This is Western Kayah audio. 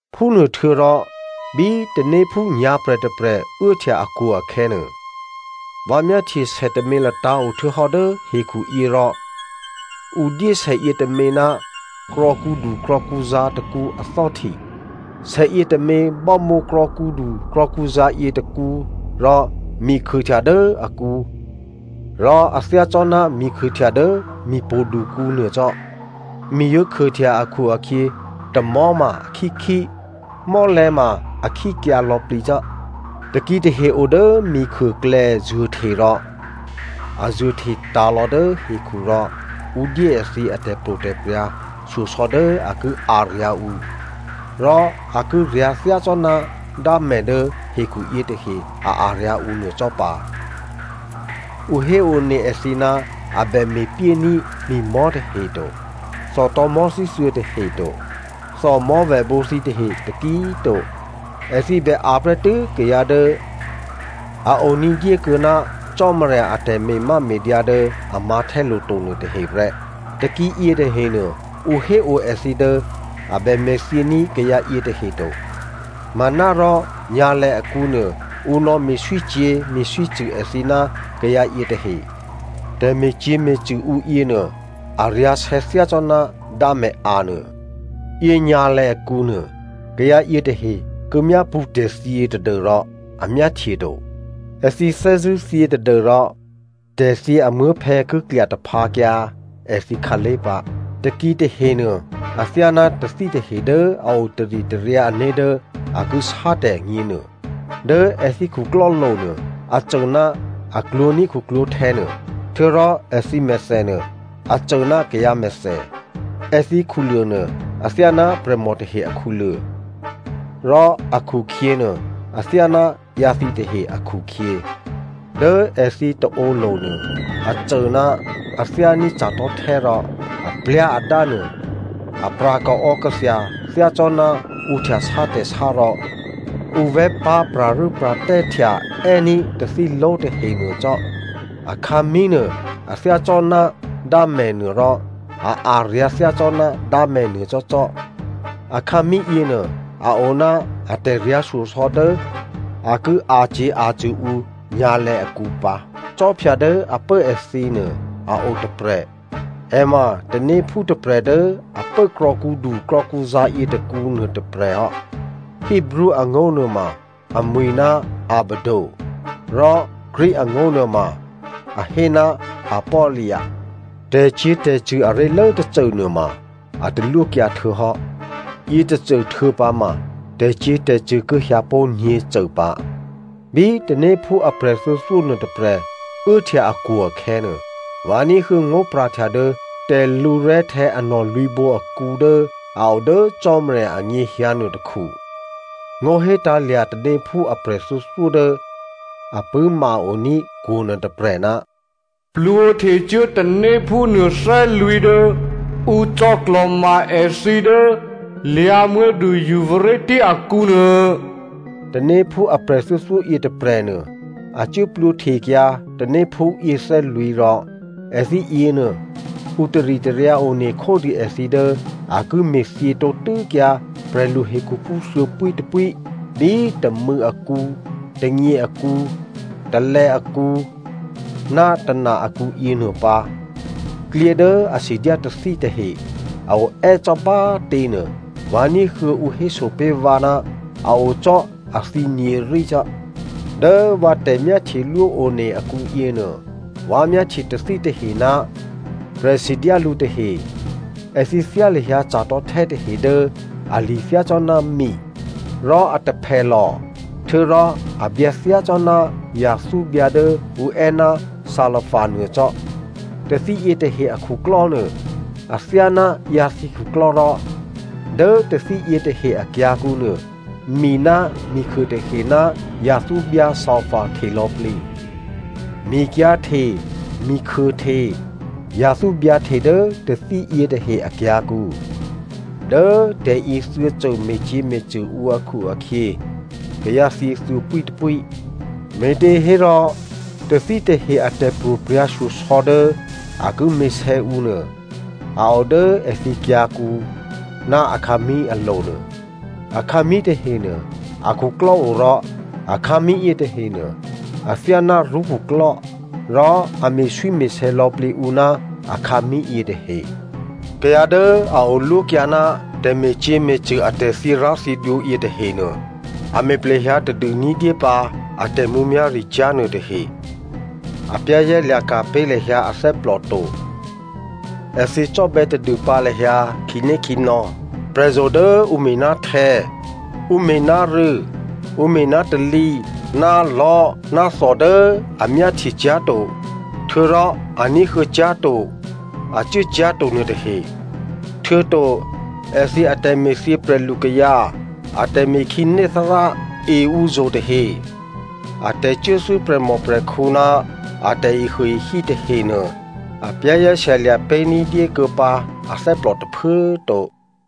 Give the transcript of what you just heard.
Phúnuôhtuô̌rò bí tanéphú nyǎ̤prè̤ tôprè̤ uốhtya akwo̤ akhè̌nuô, vǎ myáhtye sè tômě latǎ̤ o htuô̌hò́ dố hekhu yě rò ǔ dyé sè yětômě ná krò̌kǔdu krò̌kǔzǎ̤ tôkǔ athò́hti. Sèyě tômě bámǒ krò̌kǔdu krò̌kǔzǎ̤ yětôkǔ rò mikhuôhtya dố akǔ rò a thyácò́ná mikhuôhtya dố mipo̤dukǔ nuô cò́. Mi yǒ khuôhtya akhu-akhyě, tamò̤́ ma akhíkhí, mò́lè̤̌ ma a khíkyǎ lò̌plǐcò́. Takǐ tahe o dố mikhuôklè̌ zuô̤hte rò a zuô̤hte tǎ̤lò̌ dố hekhu rò ǔ dyé èthǐ atè̤pro̤prya̤ shyosò̌ dố a ki a̤ryǎ̤ ǔ, rò a ki ryǎ̤ thyácò́ná dámè̤ dố hekhuyě tahe a a̤ryǎ̤ ǔ nuô cò́ pǎ. Ǔ héone èthǐ ná a bè me̤pyéní̤ mi̤mò̤́ tahe to, thòtò̤̌mò̤́ thíthuô̌ tahe to, thòmò̤́vèbǒ thǐtahe taki꤮ to. Èthǐ bè a̤ prè́tû́ kayǎ dố a o ní̤dyé kuô̌ná Cò́marya atè̤me̤máme̤dyǎ dố a mǎ̤htè́lo̤ to nuôtahe prè́. Takǐ yětahenuô, ǔ hé o èthǐ dố a bè me̤thyění̤ kayǎ yětahe to manárò nyǎ̤lè̌ akǔnuô, ǔ nò̌me̤swícyě̤ me̤swícṳ̂ èthǐ ná kayǎ yětahe. Tè̤me̤cyě̤me̤cṳ̂ ǔ yěnuô, a̤ryǎ̤sè̌ thyácò́ná dámè̤ a̤ nuô. Yěnyǎ̤lè̌ akǔnuô, kayǎ yětahe ki myápṳ̌ tè̤thyě tadû́rò a myáhtye to. Èthǐ thè́zṳ̂́ thyě tadû́rò tè̤thyě amuố̤phè̌ ki klya taphǎkyǎ èthǐ khǎlé̤ pǎ. Takǐ tahenuô athyáná tathí tahe dố a o taritaryǎ ané̤ dố a ki sátè̤ agně nuô. Dố èthǐ khuklò́lo̤ nuô a cô ná a klwǒ̤ní̤ khuklwǒ̤htè̌ nuô, htuô̌rò èthǐ mèthè nuô, a cô ná kayǎ mèthè. Èthǐ khuluô̤ nuô, athyáná prè̤mò tahe akhuluô̤ rò akhukhyě nuô athyáná ǎyǎthǐ tahe akhukhyě. Dố èthǐ taǒlo̤ nuô a cô ná a thyání̤ ca̤tò̤́htè́ rò a plyá̤ adánuô apra̤ kaò̌kathya thyácò́ná ǔ htyasá tè̤sá rò ǔ vè̤́pá̤ pra̤rû́pra̤tè́htya è́ní̤ tathíló̤ tahe nuô cò́. Akhǎmí̤ nuô, a thyácò́ná dámè̤nuô rò a a̤ryǎ̤ thyácò́ná dámè̤nuô cò́cò́. Akhǎmí̤ yěnuô, a o ná atè̤ryǎ̤ shyosò̌ dố a ki a̤cyě̤ a̤cṳ̂ ǔ nyǎ̤lè̌ akǔ pǎ. Khwí dố a pố èthǐnuô a otôprè̤. È ma tanéphú tôprè̤ dố a pố krò̌kǔdu krò̌kǔzǎ̤ yětôkǔ nuôtôprè̤ hò́. Hebreo angó̤ nuôma amwi̤ ná Abaddon rò Greek angó̤ nuôma, a hé ná Apollyona. Tè̤cyě̤tè̤cṳ̂ aré̤lố tôcô nuôma, a talwókyǎ htuô̌hò́. Yětôcô htuô̌pǎ ma tè̤cyě̤tè̤cṳ̂ ki hyǎ pó̤ nyě̤cô pǎ. Bí tanéphú aprè̤ thuô̌thyó nuôtôprè̤ uốhtya akwo̤ akhè̌nuô, vǎ ní̤huô̌ ngó̤pra̤htya dố tè̤lǔrè̤́htè̌ anò̤ lwǐ̤bǒ akǔ dố a o dố Cò́marya anyěhyǎ nuôtôkhu. Ngó̤ hétǎ̤lya̤ tanéphú aprè̤ thuô̌thyó dố a pṳ̂́ma-oní̤ kwo̤ nuôtôprè̤, “Plwǒhtecuố tanéphú nuôthè́lwǐ̤ dố ǔ cò̌klò̤ma èthǐ dố lyǎ̤muố̤du Euphrate akǔnuô.” Tanéphú aprè̤ thuô̌thyó yětôprè̤nuô, a cuố plwǒhtekyǎ tanéphú yěthè́lwǐ̤ rò èthǐ yěnuô, ǔ taritaryǎ one khódû èthǐ dố a ki me̤thyě tǒtû́kyǎ prè̤lu hekhuphú thuô̌pwítôpwí bí tômû̌ akǔ, tônyě akǔ, tôlè̌ akǔ ná tôna akǔ yěnuô pǎ. Klyě dố a sidyá tathí tahe a oè́ cò́ bá꤮ těnuô, vǎ ní̤huô̌ ǔ hésopé̤ vǎ ná a o cò́ athǐ nyě̤rí cò́. Dố vǎ tè̤myáhtyelwó one akǔyěnuô vǎ myáhtye tathí tahe ná prè̤sidyá lǔ tahe. Èthǐ thyá lahyǎ ca̤tò̤́htè́ tahe dố ali̤ thyácò́ná mi, rò a taphèlò̤, htuô̌rò a byǎ thyácò́ná yathúbyǎ dố ǔ è́ ná salapha nuô cò́. Tathí yětahe akhuklò́ nuô, athyáná ǎyǎthǐ khuklò́ rò dố tathí yětahe akyǎ̤kǔ nuô, mi ná mikhuô tahe ná yathúbyǎ salapha hte lò̌plǐ. Mikyǎ̤hte, mikhuôhte, yathúbyǎ hte dố tathí yětahe akyǎ̤kǔ. Dố tè̤yěthuô̌cô me̤cyě̤me̤cṳ̂ ǔ akhu-akhyě, kayǎ thyě thuô̌pwítôpwí. Me̤těhérò tathí tahe a tè̤pro̤prya̤shyosò̌ dố a ki me̤sè̌ǔ nuô, a o dố èthǐ kyǎ̤kǔ ná akhǎmí̤ alo̤nuô. Akhǎmí̤ tahenuô a khuklò́o rò akhǎmí̤ yětahenuô, athyáná rṳ́ khuklò́, rò a me̤swíme̤sè̌ lò̌plǐ ǔ ná akhǎmí̤ yětahe. Kayǎ dố a olwókyǎ ná tè̤me̤cyě̤me̤cṳ̂ atè̤ thyěrá̤thyědwǒ yětahenuô, a me̤ plehyǎ tadû ní̤dyépǎ a tè̤mǔmyá̤ricyá̤ nuôtahe. A za̤ ní̤ pé̤ lahyǎ ané̤ to. Èthǐ cò́bè̌ tadûpǎ lahyǎ khǐnékhǐnò̌, prè̤zo̤ dố ǔ me̤ná htè̌, ǔ me̤ná rû̌, ǔ me̤ná talǐ ná lò̤́ ná thò dố a myáhtyecyá̤to, htuô̌rò a ní̤huô̌ cyá̤to, a cuốcyá̤to nuôtahe. Htuô̌to èthǐ atè̤me̤thyě prè̤lukayǎ, atè̤me̤ khǐné Thárá e ǔzo̤ tahe, a tè̤cuốthû́ prè̤mòprè̤khǔ ná a tè̤ehuôehí tahenuô, a za̤ ní̤dûkuô̌ pǎ ané̤ tôphuố꤮ to.